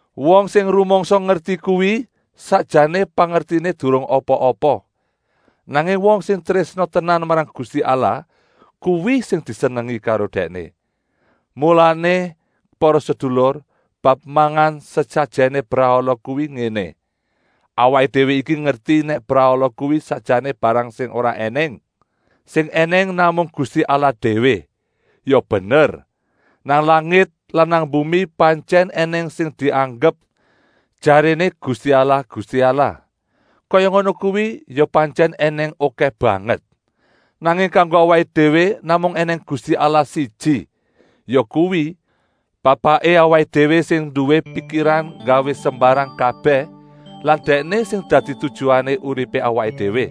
Wong sing rumangsa ngerti kuwi sakjané pangertiné durung apa-apa. Nanging wong sing trésna tenan marang Gusti Allah, kuwi sing disenengi karo Dèkné. Mulané para sedulur, bab mangan sesajèné brahala kuwi ngéné! Awaké déwé iki ngerti nèk brahala kuwi sakjané barang sing ora ènèng. Sing ènèng namung Gusti Allah déwé. Ya bener, nang langit lan nang bumi pantyèn ènèng sing dianggep jaréné gusti allah-gusti allah. Kaya ngono kuwi ya pantyèn ènèng okèh banget. Nanging kanggo awaké déwé namung ènèng Gusti Allah siji, yakuwi, Bapaké awaké déwé sing nduwé pikiran nggawé sembarang kabèh lan Dèkné sing dadi tujuané uripé awaké déwé.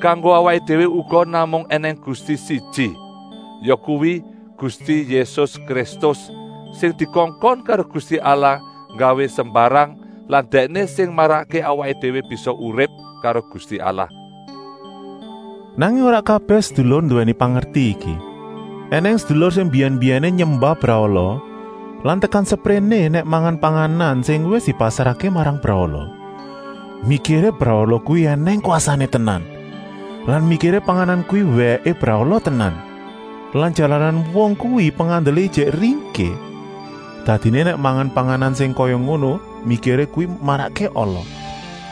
Kanggo awaké déwé uga namung ènèng Gusti siji, yakuwi, Gusti Yésus Kristus, sing dikongkon karo Gusti Allah nggawé sembarang lan Dèkné sing marakké awaké déwé bisa urip karo Gusti Allah. Nanging ora kabèh sedulur nduwèni pangerti iki. Enèng sedulur sing mbiyèn-mbiyèné nyembah brahala lan tekan sepréné nèk mangan panganan sing wis dipasrahké marang brahala, mikiré brahala kuwi ènèng kwasané tenan lan mikiré panganan kuwi wèké brahala tenan. Lan jalaran wong kuwi pengandelé ijik ringkih, dadiné nèk mangan panganan sing kaya ngono mikiré kuwi marakké ala.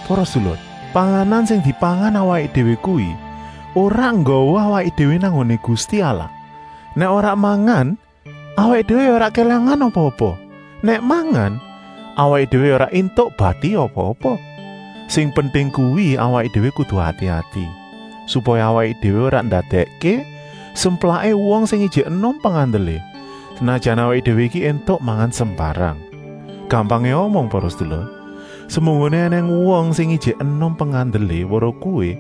Para sedulur, panganan sing dipangan awaké déwé kuwi ora nggawa awaké déwé nang nggoné Gusti Allah. Nèk ora mangan, awaké déwé ya ora kélangan apa-apa, nèk mangan, awaké déwé ya ora éntuk bati apa-apa. Sing penting kuwi awaké déwé kudu ati-ati, supaya awaké déwé ora ndadèkké semplaké wong sing ijik enom pengandelé, senajan awaké déwé iki éntuk mangan sembarang. Gampangé omong para sedulur, semunggoné ènèng wong sing ijik enom pengandelé weruh kowé,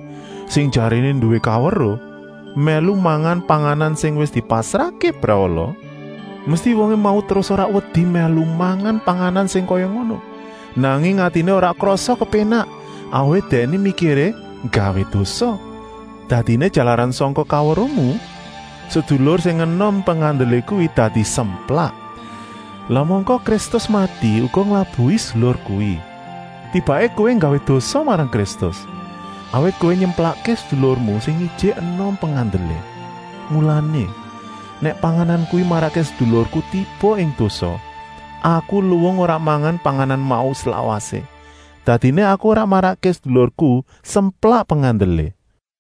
sing jaréné nduwé kaweruh, mèlu mangan panganan sing wis dipasrahké brahala, mesti wongé mau terus ora wedi mèlu mangan panganan sing kaya ngono, nanging atiné ora krasa kepénak, awit dèkné mikiré nggawé dosa. Dadiné jalaran sangka kaweruhmu, sedulur sing enom pengandelé kuwi dadi semplak. Lah mangka Kristus mati uga nglabuhi sedulur kuwi. Tibaké kowé nggawé dosa marang Kristus, awit kowé nyemplakké sedulurmu sing ijik enom pengandelé. Mulané, nèk panganan kuwi marakké sedulurku tiba ing dosa, aku luwung ora mangan panganan mau slawasé, dadiné aku ora marakké sedulurku semplak pengandelé.